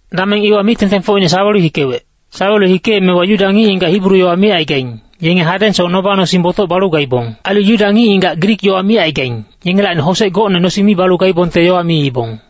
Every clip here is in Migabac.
Dameng iwa mic-tengtengfocine sawelu hikewec. Sawelu hikeemewa Yuda ngic-ngigac Hibru yowa micaigaing, yenge hadengsoc noba-nosing botoc balu gaibong. Ailu Yuda ngic-ngigac Grik yowa micaigaing, yengelacni hosec gocne nosing mi balu gaibongte ailu yowa miibong.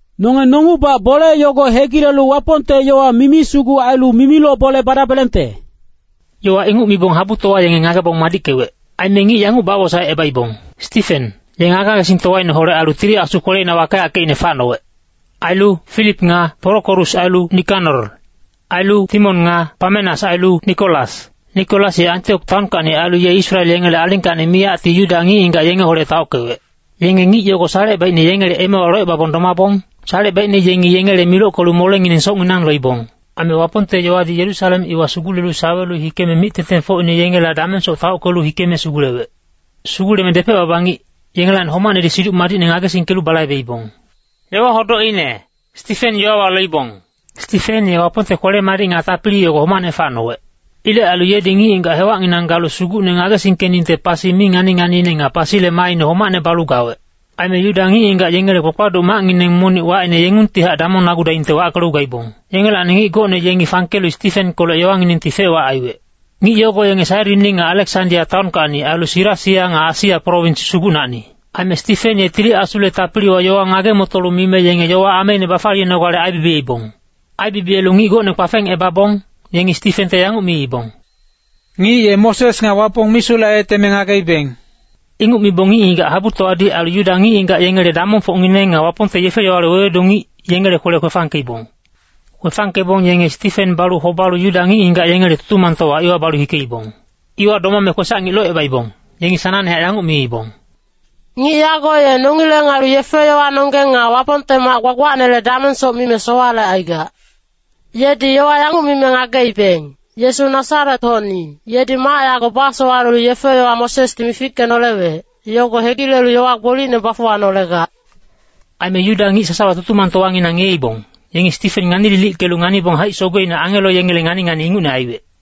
Nonge nongungbac bole yogo hegilelu Wapongte yowa mimi sugu ailu mimiloc bole badabelengte.” Yowa inguc mibong habutowa yenge ngagebong madickewec. Aime ngic yanguc bawosaecebaibong, Stifen, ye ngage-ngagesingtowaineholec ailu Tili Asu kweleina wakeyackeicne facnowec. Ailu Filip nga Porokorus ailu Nikanor. Ailu Timon nga Pamenas ailu Nikolas. Nikolas ye Antiok taonkacni ailu ye Israel yengele alingkacni miyacti Yuda ngic-ngigac yengeholec taockewec. Yenge ngic yogo salecebaicne yengele emewa locebabong domabong, salecebaicne yengi yengele milockelu molengineng socnginang loibong. Aime Wapongte yowadi Yerusalem iwa sugulelu sawelu hikeme mic-tengtengfocine yengela damengsoc taockelu hikeme sugulewec. Suguleme depec-baba ngic, yengelacni homacnedi Siduc Madicne ngagesingkelu balaibeibong. Stifen ye Wapongte kwele-madic nga tapili yogo homacne facnowec. Ilec ailu yedi ngic-ngigac hewacnginang galu Sugucne ngagesingkeningte pasi mi ngani-nganiine nga pasile maaine homacne balu gawec. Aime Yuda ngic-ngigac yengele kpakpaduc macngineng monic wacine Yengungtihac Damongnagudaingte wackelu gaibong. Yengelacni ngic gocne yengi fangkelu Stifenkolec yowanginengti fec-wac aiwec. Ngic yogo yenge Sairini nga Aleksandia taonkacni ailu Silisia nga Asia prowins sugucnacni. Aime Stifen ye Tili Asule tapiliwa yowa ngage-motolu mime yenge yowa ameine bafaliyenogale aibibiyeibong. Aibibiyelu ngic gocne kpafengebabong, yengi Stifente yanguc miibong, “Ngic ye Moses nga Wapong misulec aiyeteme ngageibeng.” Inguc mibong ngic-ngigac habutowadi ailu Yuda ngic-ngigac yengele damongfocngineng nga Wapongte yefe-yowale wewedu ngic, yengele kwele kwefangkeibong. Kwefangkebong yenge Stifen balu hobalu Yuda ngic-ngigac yengele Tutumangtowa iwa bahikeibong. Iwa domame kwesac-ngic locebaibong, yengi sanangnehac yanguc miibong, “Ngic yago ye nongileng ailu yefe-yowanonggeng nga Wapongte mac gbagbacnele damengsoc mime sowalecaigac. Yedi yowa yanguc mime ngageibeng, ‘Yesu Nasaret-hocni, yedi mac yago basowalelu yefe-yowa Mosesdi mifickenolewec, yogo hegilelu yowa gbolicne bafuwanolegac.’” Aime Yuda ngic sasawa Tutumangtowanginang ngiyeibong, yengi Stifen ngani-lilickelu nganibong haic-sogeine angelo yengele ngani-ngani ingucne aiwec.